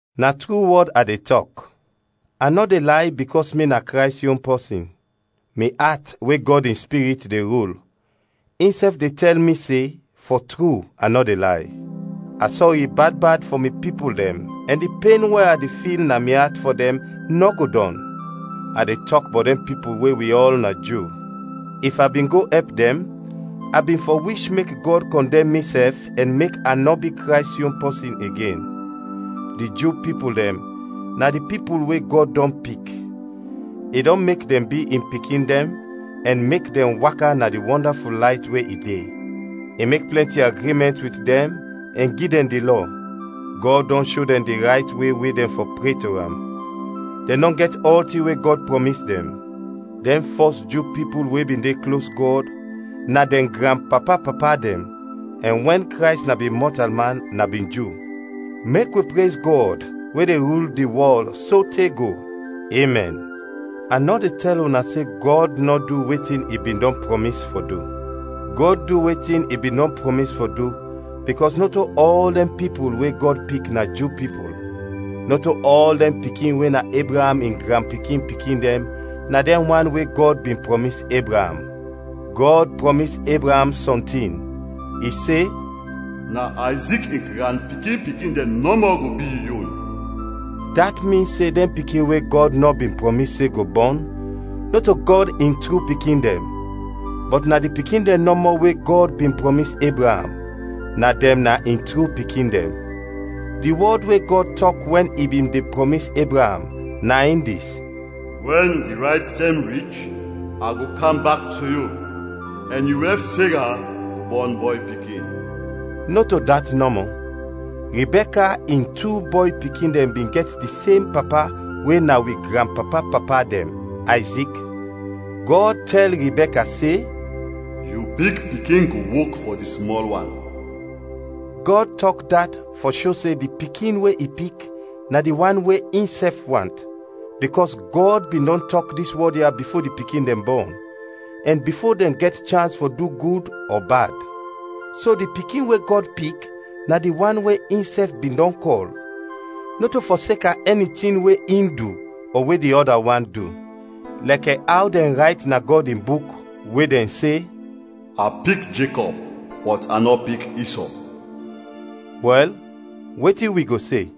Na tru wɔd a de tɔk; a nɔ de lay bikɔs mi na Krays yon pɔsin. Mi at we Gɔd in Spirit de rul, insɛf de tɛl mi se, fɔ tru, a nɔ de lay. A sɔri bad bad fɔ mi pipul dɛn ɛn di pen we a de fil na mi at fɔ dɛn, nɔ go dɔn; a de tɔk bɔt dɛn pipul we wi ɔl na Ju. If a bin go ɛp dɛn, a bin fɔ wish mek Gɔd kɔndɛm misɛf ɛn mek a nɔ bi Krays yon pɔsin igen. Di Ju pipul dɛn na di pipul we Gɔd dɔn pik; i dɔn mek dɛn bi in pikin dɛn ɛn mek dɛn waka na di wɔndaful layt we i de; i mek plɛnti agrimɛnt wit dɛn ɛn gi dɛn di Lɔ; Gɔd dɔn sho dɛn di rayt we we dɛn fɔ pre to am; dɛn dɔn gɛt ɔltin we Gɔd prɔmis dɛn. Dɛn fɔs Ju pipul we bin de klos Gɔd na dɛn granpapa-papa dɛn, ɛn wɛn Krays na bin mɔtalman, na bin Ju. Mek wi prez Gɔd, we de rul di wɔl, sote go! Emɛn. A nɔ de tɛl una se Gɔd nɔ du wetin i bin dɔn prɔmis fɔ du. Gɔd du wetin i bin dɔn prɔmis fɔ du bikɔs nɔto ɔl dɛn pipul we Gɔd pik na Ju pipul; nɔto ɔl dɛn pikin we na Ebraam in granpikin-pikin dɛn na dɛn wan we Gɔd bin prɔmis Ebraam. Gɔd prɔmis Ebraam sɔntin, i se, “Na Ayzik in granpikin-pikin dɛn nɔmɔ go bi yu yon.” Dat min se dɛn pikin we Gɔd nɔ bin prɔmis se go bɔn, nɔto Gɔd in tru pikin dɛn, bɔt na di pikin dɛn nɔmɔ we Gɔd bin prɔmis Ebraam, na dɛn na in tru pikin dɛn. Di wɔd we Gɔd tɔk wɛn i bin de prɔmis Ebraam, na in dis: “Wɛn di rayt tɛm rich, a go kam bak to yu, ɛn yu wɛf, Sera, go bɔn bɔy pikin.” Nɔto dat nɔmɔ, Ribɛka in tu bɔy pikin dɛn bin gɛt di sem papa we na wi granpapa-papa dɛn, Ayzik. Gɔd tɛl Ribɛka se, “Yu big pikin go wok fɔ di smɔl wan.” Gɔd tɔk dat fɔ sho se di pikin we i pik na di wan we insɛf want, bikɔs Gɔd bin dɔn tɔk dis wɔd ya bifo di pikin dɛn bɔn, ɛn bifo dɛn gɛt chans fɔ du gud ɔ bad. So di pikin we Gɔd pik na di wan we insɛf bin dɔn kɔl, nɔto fɔseka ɛni tin we in du ɔ we di ɔda wan du. Lɛkɛ aw dɛn rayt na Gɔd in Buk, we dɛn se, “A pik Jekɔb, bɔt a nɔ pik Isɔ.” Wɛl, wetin wi go se?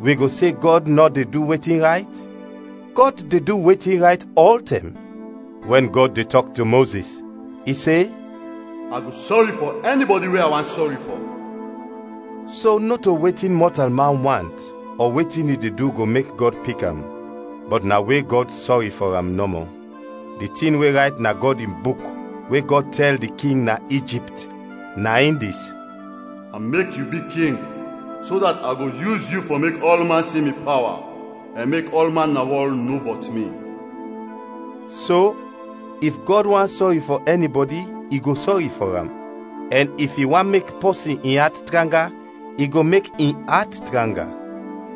Wi go se Gɔd nɔ de du wetin rayt? Gɔd de du wetin rayt ɔltɛm! Wɛn Gɔd de tɔk to Mozis, i se, “A go sɔri fɔ ɛnibɔdi we a want sɔri fɔ.” So nɔto wetin mɔtalman want ɔ wetin i de du go mek Gɔd pik am, bɔt na we Gɔd sɔri fɔ am nɔmɔ. Di tin we rayt na Gɔd in Buk we Gɔd tɛl di king na Ijipt, na in dis: “A mek yu bi king, so dat a go yus yu fɔ mek ɔlman si mi pawa, ɛn mek ɔlman na wɔl no bɔt mi.” So, if Gɔd want sɔri fɔ ɛnibɔdi, i go sɔri fɔ am; ɛn if i want mek pɔsin in at tranga, i go mek in at tranga.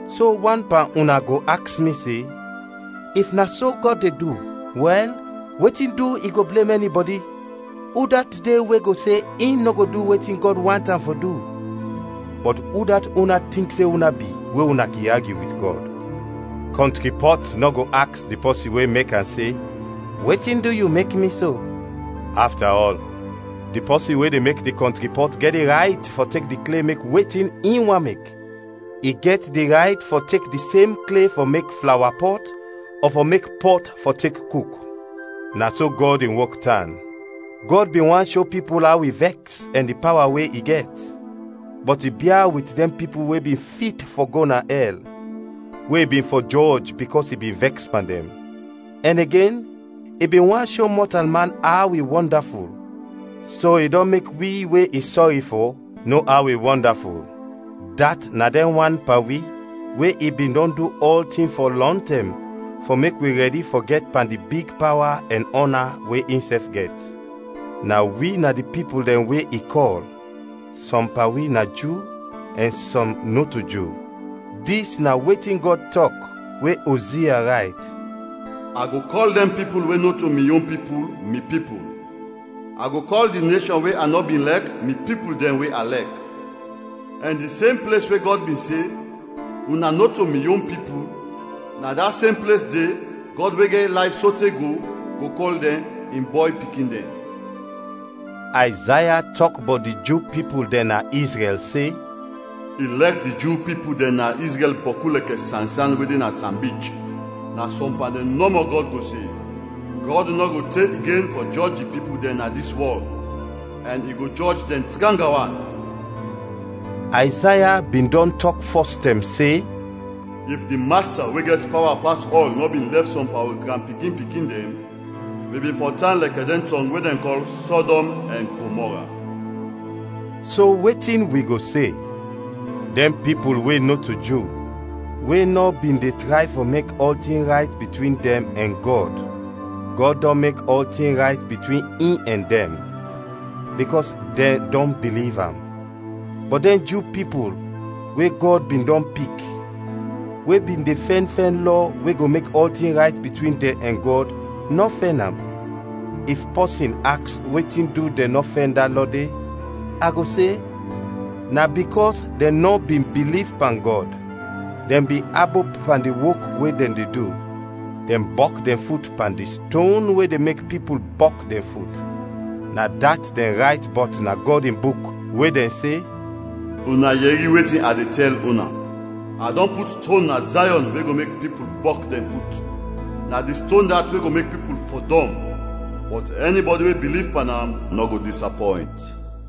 So wan pan una go aks mi se, “If na so Gɔd de du, wɛl, wetin du i go blem ɛnibɔdi? Udat de we go se in nɔ go du wetin Gɔd want am fɔ du?” Bɔt udat una tink se una bi we una kin agyu wit Gɔd? Kɔntri pɔt nɔ go aks di pɔsin we mek am se, “Wetin du yu mek mi so?” Afta ɔl, di pɔsin we de mek di kɔntri pɔt gɛt di rayt fɔ tek di kle mek wetin i want mek. I gɛt di rayt fɔ tek di sem kle fɔ mek flawa pɔt ɔ fɔ mek pɔt fɔ tek kuk. Na so Gɔd in wok tan. Gɔd bin want sho pipul aw i vɛks ɛn di pawa we i gɛt. Bɔt i bia wit dɛn pipul we bin fit fɔ go na ɛl, we i bin fɔ jɔj bikɔs i bin vɛks pan dɛn. Ɛn igen, i bin want sho mɔtalman aw i wɔndaful, so i dɔn mek wi we i sɔri fɔ no aw i wɔndaful, dat na dɛn wan pan wi we i bin dɔn du ɔltin fɔ lɔntɛm fɔ mek wi rɛdi fɔ gɛt pan di big pawa ɛn ɔna we insɛf gɛt. Na wi na di pipul dɛn we i kɔl, sɔm pan wi na Ju ɛn sɔm nɔto Ju. Dis na wetin Gɔd tɔk we Ozia rayt: “A go kɔl dɛn pipul we nɔto mi yon pipul, ‘Mi Pipul.’ A go kɔl di neshɔn we a nɔ bin lɛk, ‘Mi Pipul Dɛn We A Lɛk.’ Ɛn di sem ples we Gɔd bin se, ‘Una nɔto mi yon pipul’, na da sem ples de, Gɔd we gɛt layf sote go, go kɔl dɛn, ‘In bɔy pikin dɛn.’” Ayzaya tɔk bɔt di Ju pipul dɛn na Izrɛl se, “Ilɛk di Ju pipul dɛn na Izrɛl bɔku lɛkɛ sansan we de na sanbich, na sɔm pan dɛn nɔmɔ Gɔd go sev, Gɔd nɔ go te igen fɔ jɔj di pipul dɛn na dis wɔl, ɛn i go jɔj dɛn tranga wan.” Ayzaya bin dɔn tɔk fɔs tɛm se, “If di Masta we gɛt pawa pas ɔl nɔ bin lɛf sɔm pan wi granpikin-pikin dɛn, wi bin fɔ tan lɛkɛ dɛn tɔng we dɛn kɔl Sɔdɔm ɛn Gomɔra.” So, wetin wi go se? Dɛn pipul we nɔto Ju, we nɔ bin de tray fɔ mek ɔltin rayt bitwin dɛn ɛn Gɔd, Gɔd dɔn mek ɔltin rayt bitwin in ɛn dɛn, bikɔs dɛn dɔn biliv am; bɔt dɛn Ju pipul we Gɔd bin dɔn pik, we bin de fɛn fɛn lɔ we go mek ɔltin rayt bitwin dɛn ɛn Gɔd, nɔ fɛn am. If pɔsin aks wetin du dɛn nɔ fɛn da lɔ de, a go se, na bikɔs dɛn nɔ bin biliv pan Gɔd, dɛn bin abop pan di wok we dɛn de du. Dɛn bɔk dɛn fut pan di “ston we de mek pipul bɔk dɛn fut.” Na dat dɛn rayt bɔt na Gɔd in Buk we dɛn se: “Una yɛri wetin a de tɛl una, a dɔn put ston na Zayɔn we go mek pipul bɔk dɛn fut, na di ston dat we go mek pipul fɔdɔm. Bɔt ɛnibɔdi we biliv pan am nɔ go disapɔynt.”